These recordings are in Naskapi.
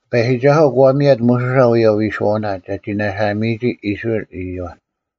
ᑎᐸᔨᒋᒐᓱᐤ ᒂ ᒥᔭᑦ ᒧᓱᓴ ᐅᔭ ᐎᓱᐛᐅᓇ ᒐᒋ ᓇᓴᒥᔨᒋ ᐃᔅᕋᐃᓪ ᐃᔪᐛ᙮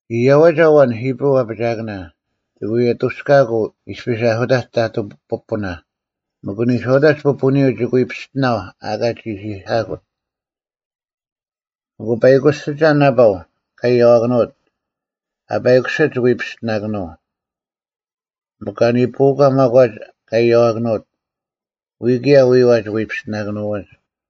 ᐃᔭᐛᒐ ᐊᐛᓐ ᐃᑉᕈᐤ ᐊᐱᒋᐊᑭᓇ, ᒋᑭ ᐎ ᐊᑐᔅᑲᑯᐤ ᐃᔅᐱᔅ ᐊᓱᑕᒡ ᑕᑐᐤ ᐱᐳᓇ, ᒥᒄ ᓂᔄᐅᑕᒡ ᐱᐳᓂᔪᐤ ᒋᑭ ᐎ ᐱᔅᑎᓇᐤ ᐊᑲ ᒋᓯᐧᑲᑯᑦ᙮ ᐊᑯ ᐸᐃᑯᓯᒐ ᓇᐸᐤ ᑲ ᐊᔭᐛᑭᓄᐅᑦ, ᐊ ᐸᐃᑯᓯᑦ ᒋᑭ ᐎ ᐱᔅᑎᓇᑭᓄᐤ᙮ ᒥᒄ ᑲ ᓂᐳᐅᒂ ᒪᒂᒡ ᑲ ᐃᔭᐛᑭᓄᐅᑦ, ᐎᔾ ᑭᔭ ᐎᐛ ᒋᑭ ᐎ ᐱᔅᑎᓇᑭᓄᐎᒡ᙮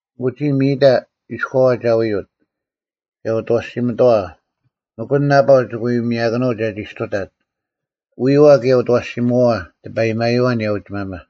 ᐊᑯ ᒋᔾ ᒥᔨᑕ ᐃᔎᐛ ᒐ ᐎᐅᑦ, ᑭᔭ ᐅᑦ ᐊᐛᓯᒥᑕᐛ, ᒥᒄ ᐊᓐ ᓇᐸᐤ ᒋᑭ ᐎ ᒥᔭᑭᓄᐤ ᒐᒋ ᒋᔅᑐᑕᑦ; ᐎᐛ ᑭᔭ ᐅᑦ ᐊᐛᓯᒧᐛᐛ ᑎᐸᔨᒪᔪᐛ ᐊᓂᔭ ᐅᒋᒪᒪ᙮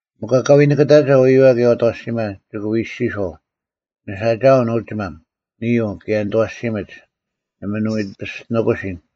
ᒥᒄ ᐊᑲ ᐎ ᓂᑭᑕᒐ ᐎᐛ ᑭᔭ ᐅᑦ ᐊᐛᓯᒪ, ᒋᑭ ᐎ ᐃᔅᒋᔄᐤ, “ᓂᓴᒋᐊᐤ ᓄᒋᒪᒻ, ᓂᐅ, ᑭᔭ ᓂᑦ ᐊᐛᓯᒥᒡ᙮ ᓇᒪ ᓂ ᐎ ᐱᔅᑎᓂᑯᓯᓐ᙮”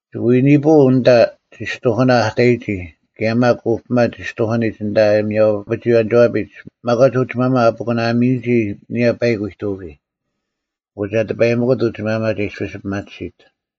ᒋᑭ ᐎ ᓂᐳᐤ ᐊᓐᑕ ᔅᑐᐧᑭᓇ ᐊ ᑕᔨᒋ ᑭᔭ ᒪᒃ ᐅᐱᒪ ᔅᑐᐧᑭᓂᒡ ᐊᓐᑕ ᐊᔭᒥᐊᐅᐱᒍᐎᔭᓂᒋᐛᐱᒡ ᒪᒂᒡ ᐅᒋᒪᒪ ᐊ ᐱᑯᓇᒥᔨᒋ ᐊᓂᔭ ᐸᐃᒄ ᐎᑐᑭᔾ᙮ ᐊᑯ ᒐ ᑎᐸᔨᒥᑯᑦ ᐅᒋᒪᒪ ᒐ ᐃᔅᐱᔅ ᐱᒪᑎᓯᑦ᙮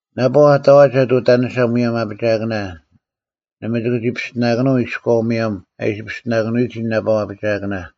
ᓇᐸᐤ ᐊᑕᐛᒐᑦ ᐅᑕᓂᓴ ᒧᔭᒻ ᐊᐱᒋᐊᑭᓇ, ᓇᒪ ᒋᑭ ᒋ ᐱᔅᑎᓇᑭᓄᐤ ᐃᔎᐤ ᒧᔭᒻ ᐊ ᐃᓯ ᐱᔅᑎᓇᑭᓄᐎᒋ ᓇᐸᐤ ᐊᐱᒋᐊᑭᓇ᙮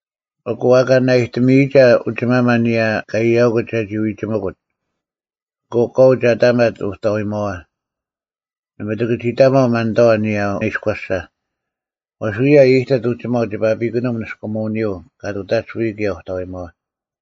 ᐊᑯ ᐊᑲ ᓇᐊᔨᑎᒪᐊᒐ ᐅᒋᒪᒪ ᐊᓂᔭ ᑲ ᐃᔭᐅᑯᑦ ᒐᒋ ᐎᒋᒥᑯᑦ᙮ ᐊᑯ ᑲᐤ ᒐ ᑕᒪᑦ ᐅᑕᐎᒪᐛ, ᓇᒪ ᒋᑭ ᒋ ᑕᒪᐤ ᒪᓐᑕᐛ ᐊᓂᔭ ᐃᔎᓴ; ᐛᔅ ᐅᔭ ᐃᔨᑎᑦ ᐅᒋᒪᐤ ᒋᐸ ᐱᑯᓂᒻ ᓂᔅᑯᒧᐅᓂᔪᐤ ᑲ ᑐᑕᒡ ᐎᔾ ᑭᔭ ᐅᑕᐎᒪᐛ᙮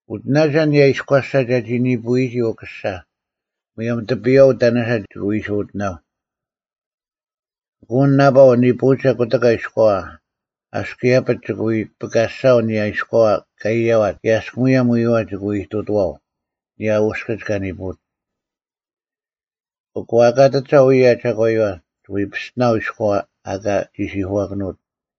ᐅᑎᓇᒐ ᐊᓂᔭ ᐃᔎᓴ ᒐᒋ ᓂᐳᐅᐎᒋ ᐅᑯᓴ, ᒧᔭᒻ ᑎᐱᔨᐛ ᐅᑕᓂᓴ ᒋᑭ ᐎ ᐃᓯ ᐅᑎᓇᐤ᙮ ᐊᑯ ᐊᓐ ᓇᐸᐤ ᓂᐳᐅᒐ ᑯᑎᑲ ᐃᔎᐛ, ᐊᔅᒄ ᐃᔭᐱᒡ ᒋᑭ ᐎ ᐱᑲᔅᒐᐊᐤ ᐊᓂᔭ ᐃᔎᐛ ᑲ ᐃᔭᐛᑦ ᑭᔭ ᐊᔅᒃ ᒧᔭᒻ ᐎᐛ ᒋᑭ ᐎ ᐃᑐᑐᐛᐤ ᐊᓂᔭ ᐅᔅᑭᒡ ᑲ ᓂᐳᐅᑦ᙮ ᐊᑯ ᐊᑲ ᑐᑕᒐ ᐅᔭ ᒐᒂᔪᐛ, ᒋᑭ ᐎ ᐱᔅᑎᓇᐤ ᐃᔎᐛ ᐊᑲ ᒋᓯᐧᑯᐛᑭᓄᐅᑦ᙮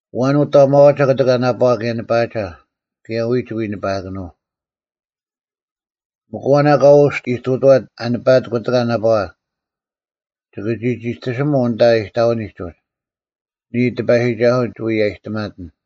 ᐊᐛᓐ ᐅᑕᒪᐛᒐ ᑯᑎᒂ ᓇᐸᐛ ᑭᔭ ᓂᐸᐊᒐ, ᑭᔭ ᐎᔾ ᒋᑭ ᐎ ᓂᐸᐊᑭᓄᐤ᙮ ᒥᒄ ᐊᐛᓐ ᐊᑲ ᐅᔅᑦ ᐃᑐᑐᐛᑦ ᐊ ᓂᐸᐊᑦ ᑯᑎᑲ ᓇᐸᐛ, ᒋᑭ ᒋ ᒋᑎᓯᒧᐤ ᐊᓐᑕ ᐃᑕᐅᓂᒡ ᐃᔅ, ᓂᔾ ᑎᐸᔨᒋᒐᓱᐤ, ᒐ ᐎᔭᔨᑎᒪᑕᓐ᙮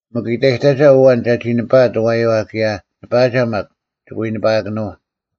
ᒥᒄ ᐃᑕᔨᑕᒐ ᐊᐛᓐ ᒐᒋ ᓂᐸᐊᑦ ᐊᐛᔪᐛ ᑭᔭ ᓂᐸᐊᒐ ᒪᒃ, ᒋᑭ ᐎ ᓂᐸᐊᑭᓄᐤ᙮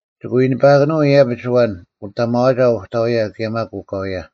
ᒋᑭ ᐎ ᓂᐸᐊᑭᓄᐤ ᐃᔭᐱᒡ ᐊᐛᓐ ᐅᑕᒪᐛᒐ ᐅᑕᐎᔭ ᑭᔭ ᒪᒃ ᐅᑲᐎᔭ᙮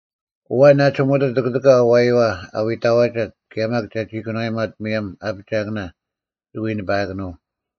ᐊᐛᓐ ᐊ ᒋᒧᑎᑦ ᑯᑎᑲ ᐊᐛᔪᐛ ᐊ ᐎ ᑕᐛᒐᑦ ᑭᔭ ᒪᒃ ᒐᒋ ᑭᓄᐛᔨᒪᑦ ᒧᔭᒻ ᐊᐱᒋᐊᑭᓇ, ᒋᑭ ᐎ ᓂᐸᐊᑭᓄᐤ᙮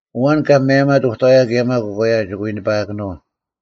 ᐊᐛᓐ ᑲ ᒪᔭᔨᒪᑦ ᐅᑕᐎᔭ ᑭᔭ ᒪᒃ ᐅᑲᐎᔭ ᒋᑭ ᐎ ᓂᐸᐊᑭᓄᐤ᙮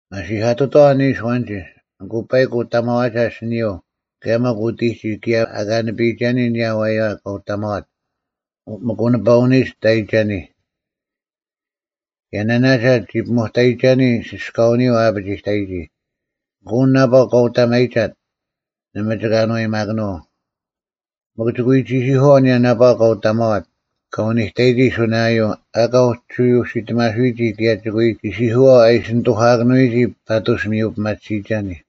ᒪᓯᐧᑲᑐᑥᐛ ᓂᓱ ᐊᐛᓐᒋ, ᐊᑯ ᐸᐃᒄ ᐅᑕᒪᐛᒐ ᐊᓯᓂᔪᐤ ᑭᔭ ᒪᒃ ᐅᑎᒋ ᑭᔭ ᐊᑲ ᓂᐱᔨᒐᓂ ᐊᓂᔭ ᐊᐛᔪᐛ ᑲ ᐅᑕᒪᐛᑦ ᒥᒄ ᐅᓂᐸᐅᓂᔨᒡ ᑕᔨᒐᓂ᙮ ᑭᔭ ᓇᓇᒐ ᒋ ᐱᒧᑕᔨᒐᓂ ᓯᔅᑲᐅᓂᔪᐤ ᐊᐱᒋᑕᔨᒋ, ᐊᑯ ᐊᓐ ᓇᐸᐤ ᑲ ᐅᑕᒪᐃᒐᑦ ᓇᒪ ᒋᑭ ᐊᓏᔨᒪᑭᓄᐤ᙮ ᒥᒄ ᒋᑭ ᐎ ᒋᓯᐧᑯᐛᐤ ᐊᓂᔭ ᓇᐸᐛ ᑲ ᐅᑕᒪᐛᑦ ᑲ ᐅᓂᑕᔨᒋ ᓱᓇᔭᔪᐤ ᐊᑲ ᐅᒋ ᐅᓯᑎᒪᓱᐎᒋ ᑭᔭ ᒋᑭ ᐎ ᒋᓯᐧᑲᓱᐛᐤ ᐊ ᐃᓯ ᓂᑐᐧᑲᑭᓄᐎᒋ ᐸᑐᔅ ᒥᔪᐱᒪᑎᓯᔨᒐᓂ᙮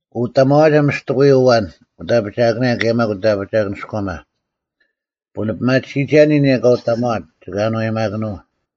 ᐊᑯ ᐅᑕᒪᐛᒐ ᒥᔅᑎᑯᔪᐤ ᐊᐛᓐ ᐅᑦ ᐊᐱᒋᐊᑭᓇ ᑭᔭ ᒪᒃ ᐅᑦ ᐊᐱᒋᐊᑭᓂᔎᒪ, ᐳᓂᐱᒪᑎᓯᐅᐎᒐᓂ ᐊᓂᔭ ᑲ ᐅᑕᒪᐛᑦ ᒋᑭ ᐊᓏᔨᒪᑭᓄᐤ᙮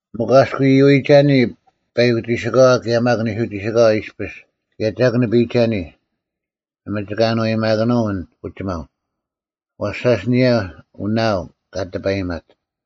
ᒥᒄ ᐊᔅᒄ ᐃᔪᐎᒐᓂ ᐸᐃᑯᒋᓯᑲᐛ ᑭᔭ ᒪᒃ ᓂᓱᒋᓯᑲᐛ ᐃᔅᐱᔅ ᑭᔭ ᒐᒃ ᓂᐱᔨᒐᓂ, ᓇᒪ ᒋᑭ ᐊᓏᔨᒪᑭᓄᐤ ᐊᓐ ᐅᒋᒪᐤ, ᐛᔅ ᓴᔅ ᐊᓂᔭ ᐅᓇᐊᐤ ᑲ ᑎᐸᔨᒪᑦ᙮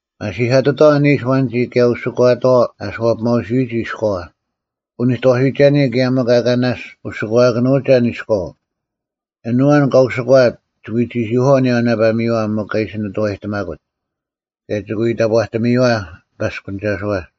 ᒪᓯᐧᑲᑐᑥᐛ ᓂᓱ ᐊᐛᓐᒋ ᑭᔭ ᐅᓯᒂᑥᐛ ᐊ ᐊᓱᐛᐱᒪᐅᓯᔪᐎᒋ ᐃᔎᐛ, ᐅᓂᑥᓱᐎᒐᓂ ᑭᔭ ᒥᒄ ᐊᑲ ᓇᔅᒡ ᐅᓯᒂᑭᓄᒐ ᐊᓐ ᐃᔎᐤ᙮ ᐊᓐ ᐊᐛᓐ ᑲ ᐅᓯᒂᐊᑦ ᒋᑭ ᐎ ᒋᓯᐧᑯᐛᐅᐤ ᐊᓂᔭ ᐅᓇᐸᒥᔪᐛ ᒥᒄ ᐊᓯ ᓂᑐᐛᑎᒪᑯᑦ, ᑭᔭ ᒋᑭ ᐎ ᑕᑈᑎᒥᔪᐛ ᑎᐸᔅᑭᓂᒐᓱᐛ᙮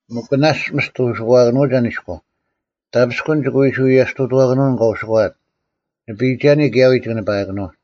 ᒥᒄ ᓇᔅᒡ ᒥᔅᑎ ᐅᓯᒂᑭᓄᐅᒐ ᐊᓐ ᐃᔎᐤ, ᑕᐱᔅᑯᓐ ᒋᑭ ᐃᓯ ᐎᔭᔅᑐᑐᐛᑭᓄᐤ ᐊᓐ ᑲ ᐅᓯᒂᐊᑦ᙮ ᓂᐱᔨᒐᓂ ᑭᔭ ᐎᔾ ᒋᑭ ᓂᐸᐊᑭᓄᐤ᙮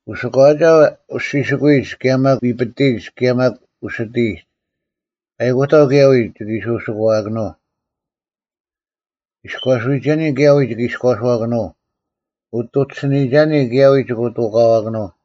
ᐅᓯᒂᐊᒐ ᐅᔅᒋᓱᑯᐎᒡ ᑭᔭ ᒪᒃ ᐎᐱᑎᔨᒡ ᑭᔭ ᒪᒃ ᐅᓯᑎᔨᒡ᙮ ᐸᐃᑯᑕᐤ ᑭᔭ ᐎᔾ ᒋᑭ ᐃᓯ ᐅᓯᒂᐊᑭᓄᐤ᙮ ᐃᔎᓱᐎᒐᓂ ᑭᔭ ᐎᔾ ᒋᑭ ᐃᔎᓱᐛᑭᓄᐤ, ᐅᑐᒋᓯᓂᒐᓂ ᑭᔭ ᐎᔾ ᒋᑭ ᐅᑐᑲᐛᑭᓄᐤ᙮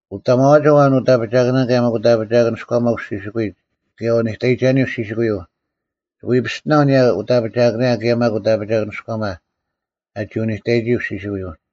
ᐅᑕᒪᐛᒐ ᐊᐛᓐ ᐅᑦ ᐊᐱᒋᐊᑭᓇ ᑭᔭ ᒪᒃ ᐅᑦ ᐊᐱᒋᐊᑭᓂᔎᒪ ᐅᔅᒋᓯᑯᐎᒡ ᑭᔭ ᐅᓂᑕᔨᒐᓂ ᐅᔅᒋᓯᑯᔪᐤ, ᒋᑭ ᐎ ᐱᔅᑎᓇᐤ ᐊᓂᔭ ᐅᑦ ᐊᐱᒋᐊᑭᓇ ᑭᔭ ᒪᒃ ᐅᑦ ᐊᐱᒋᐊᑭᓂᔎᒪ ᐊᒋ ᐅᓂᑕᔨᒋ ᐅᔅᒋᓯᑯᔪᐤ᙮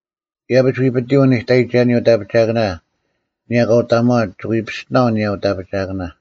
ᐃᔭᐱᒡ ᐎᐱᑎᔪᐤ ᐅᓂᑕᔨᒐᓂ ᐅᑦ ᐊᐱᒋᐊᑭᓇ ᐊᓂᔭ ᑲ ᐅᑕᒪᐛᑦ ᒋᑭ ᐎ ᐱᔅᑎᓇᐤ ᐊᓂᔭ ᐊᐱᒋᐊᑭᓇ᙮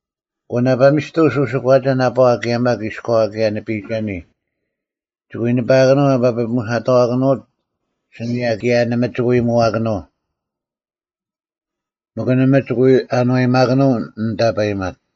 ᐊᑯ ᓇᐸᒥᔅᑐᔅ ᐅᓯᑯᐊᒐ ᓇᐸᐛ ᑭᔭ ᒪᒃ ᐃᔎᐛ ᑭᔭ ᓂᐱᔨᒐᓂ, ᒋᑭ ᐎ ᓂᐸᐊᑭᓄᐤ ᐊ ᐸᐱᐳᒧᓯᓇᑕᐊᑭᓄᐊᑦ ᐊᓯᓂᔭ ᑭᔭ ᓇᒪ ᒋᑭ ᐎ ᒧᐛᑭᓄᐤ᙮ ᒥᒄ ᓇᒪ ᒋᑭ ᐎ ᐊᓏᔨᒪᑭᓄᐤ ᐊᓐ ᑕᐸᔨᒪᑦ᙮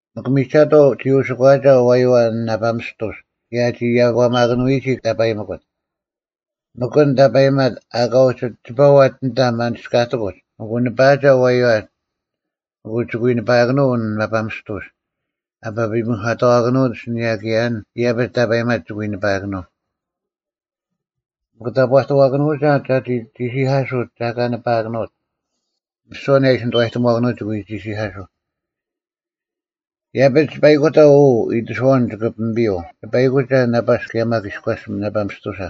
ᒥᒄ ᒥᒐᑥᐤ ᒋ ᐅᓯᒂᒐ ᐊᐛᔪᐛ ᐊᓐ ᓇᐸ ᒥᔅᑐᔅ ᑭᔭ ᐊᒋ ᐃᔭᒂᒪᑭᓄᐎᒋ ᑕᐸᔨᒥᑯᑦ, ᒥᒄ ᐊᓐ ᑕᐸᔨᒪᑦ ᐊᑲ ᐅᒋ ᒋᐸᐛᑦ ᐊᓐᑕ ᒪᓂᔅᑲᑎᑯᒡ ᐊᑯ ᓂᐸᐊᒐ ᐊᐛᔪᐛ, ᐊᑯ ᒋᑭ ᐎ ᓂᐸᐊᑭᓄᐤ ᐊᓐ ᓇᐸ ᒥᔅᑐᔅ ᐊ ᐸᐱᐳᒧᓯᓇᑕᐛᑭᓄᐅᑦ ᐊᓯᓂᔭ ᑭᔭ ᐊᓐ ᐃᔭᐱᒡ ᑕᐸᔨᒪᑦ ᒋᑭ ᐎ ᓂᐸᐊᑭᓄᐤ᙮ ᒥᒄ ᑕᑈᑐᐛᑭᓄᒐ ᒐᒋ ᒋᓯᐧᑲᓱᑦ ᒐ ᐊᑲ ᓂᐸᐊᑭᓄᐅᑦ, ᒥᓯᐛ ᐊᓂᔭ ᐊ ᐃᓯ ᓂᑐᐛᑎᒧᐛᑭᓄᐅᑦ ᒋᑭ ᐎ ᒋᓯᐧᑲᓱᐤ᙮ ᐃᔭᐱᒡ ᐸᐃᑯᑕᐤ ᐅ ᐃᑎᓱᐛᐅᓐ ᒋᑭ ᐱᒥᐱᔪᐤ ᓂᐸᐃᑯᒐ ᓇᐸᔅ ᑭᔭ ᒪᒃ ᐃᔎᔅ ᓇᐸᒥᔅᑐᓴ᙮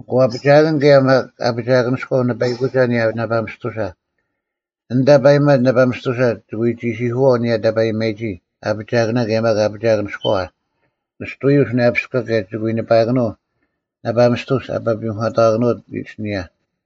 ᐊᑯ ᐊᐱᒋᐊᑭᓐ ᑭᔭ ᒪᒃ ᐊᐱᒋᐊᑭᓂᔎᐤ ᓂᐸᐃᑯᒐ ᐊᓂᔭ ᓇᐸ ᒥᔅᑐᓴ, ᐊᓐ ᑕᐸᔨᒪᑦ ᓇᐸ ᒥᔅᑐᓴ, ᒋᑭ ᐎ ᒋᓯᐧᑯᐛᐤ ᐊᓂᔭ ᑕᐸᔨᒪᔨᒋ ᐊᐱᒋᐊᑭᓇ ᑭᔭ ᒪᒃ ᐊᐱᒋᐊᑭᓂᔎᐛ ᓂᔅᑐᐎᔪᐤ ᓱᓇᔭᐱᔎ ᑭᔭ ᒋᑭ ᐎ ᓂᐸᐊᑭᓄᐤ ᓇᐸ ᒥᔅᑐᔅ ᐊ ᐸᐱᐳᒧᓯᓇᑕᐛᑭᓄᐅᑦ ᐊᓯᓂᔭ᙮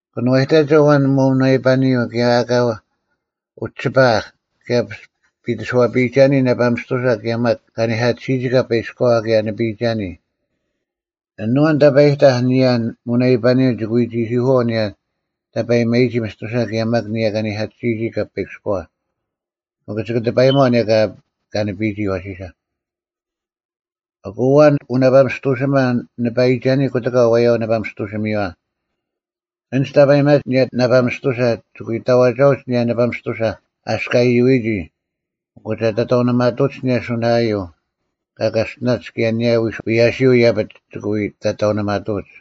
ᑭᓄᐛᔨᑕᒐ ᐊᐛᓐ ᒧᓇᐃᐸᓂᔪᐤ ᑭᔭ ᐊᑲ ᐅᒋ ᒋᐸᐊᐧᒃ, ᑭᔭ ᐱᑎᓱᐛᐱᐃᒐᓂ ᓇᐸ ᒥᔅᑐᓴ ᑭᔭ ᒪᒃ ᑲᓂᐧᑲᑎᓯᔨᒋ ᑲᐸᐃᑭᔎᐛ ᑭᔭ ᓂᐱᔨᒐᓂ᙮ ᐊᓐ ᐊᐛᓐ ᑕᐸᔨᑕᐧᒃ ᐊᓂᔭ ᒧᓇᐃᐸᓂᔪᐤ ᒋᑭ ᐎ ᒋᓯᐧᑯᐛᐤ ᐊᓂᔭ ᑕᐸᔨᒪᔨᒋ ᒥᔅᑐᓴ ᑭᔭ ᒪᒃ ᐊᓂᔭ ᑲᓂᐧᑲᑎᓯᔨᒋ ᑲᐸᐃᑭᔎᐛ᙮ ᒥᒄ ᒋᑭ ᑎᐸᔨᒪᐤ ᐊᓂᔭ ᑲ ᓂᐱᔨᒋ ᐊᐛᓯᓴ᙮ ᐊᑯ ᐊᐛᓐ ᐅᓇᐸᒥᔅᑐᓯᒪ ᓂᐸᐃᒐᓂ ᑯᑎᑲ ᐊᐛᔪᐛ ᐅᓇᐸᒥᔅᑐᓯᒥᔪᐛ, ᐊᓐᒡ ᑕᐸᔨᒪᒡ ᐊᓂᔭ ᓇᐸ ᒥᔅᑐᓴ ᒋᑭ ᐎ ᑕᐛᒐᐅᒡ ᐊᓂᔭ ᓇᐸᒥᔅᑐᓴ ᐊᔅᒄ ᐊᐃᔪᐎᒋ ᐊᑯ ᒐ ᑕᑕᐅᓂᒪᑐᒡ ᐊᓂᔭ ᓱᓇᔭᔪᐤ ᑲ ᑲᔅᑎᓇᒡ ᑭᔭ ᐊᓂᔭ ᐎᔭᓯᔪᐤ ᐃᔭᐱᒡ ᒋᑭ ᐎ ᑕᑕᐅᓂᒪᑐᐅᒡ᙮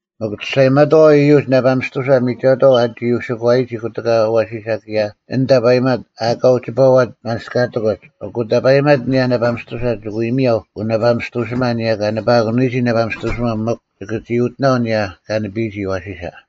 ᒥᒄ ᒋᔅᒐᔨᒪᑥᐛ ᐃᔪᒡ ᓇᐸ ᒥᔅᑐᓴ ᒥᒐᑥᐤ ᐊᒋ ᐅᓯᑯᐛᔨᒋ ᑯᑎᑲ ᐊᐛᓯᓴ ᑭᔭ ᐊᓐ ᑕᐸᔨᒪᑦ ᐊ ᐊᑲ ᐅᒋ ᒋᐸᐛᑦ ᒪᓂᔅᑲᑎᑯᒡ᙮ ᐊᑯ ᑕᐸᔨᒪᑦ ᐊᓂᔭ ᓇᐸ ᒥᔅᑐᓴ ᒋᑭ ᐎ ᒥᔭᐤ ᐅᓇᐸᒥᔅᑐᓯᒪ ᐊᓂᔭ ᑲ ᓂᐸᐊᑭᓄᐎᒋ ᐅᓇᐸᒥᔅᑐᓯᒥᔪᐛ ᒥᒄ ᒋᑭ ᒋ ᐅᑎᓇᐤ ᐊᓂᔭ ᑲ ᓂᐱᔨᒋ ᐊᐛᓯᓴ᙮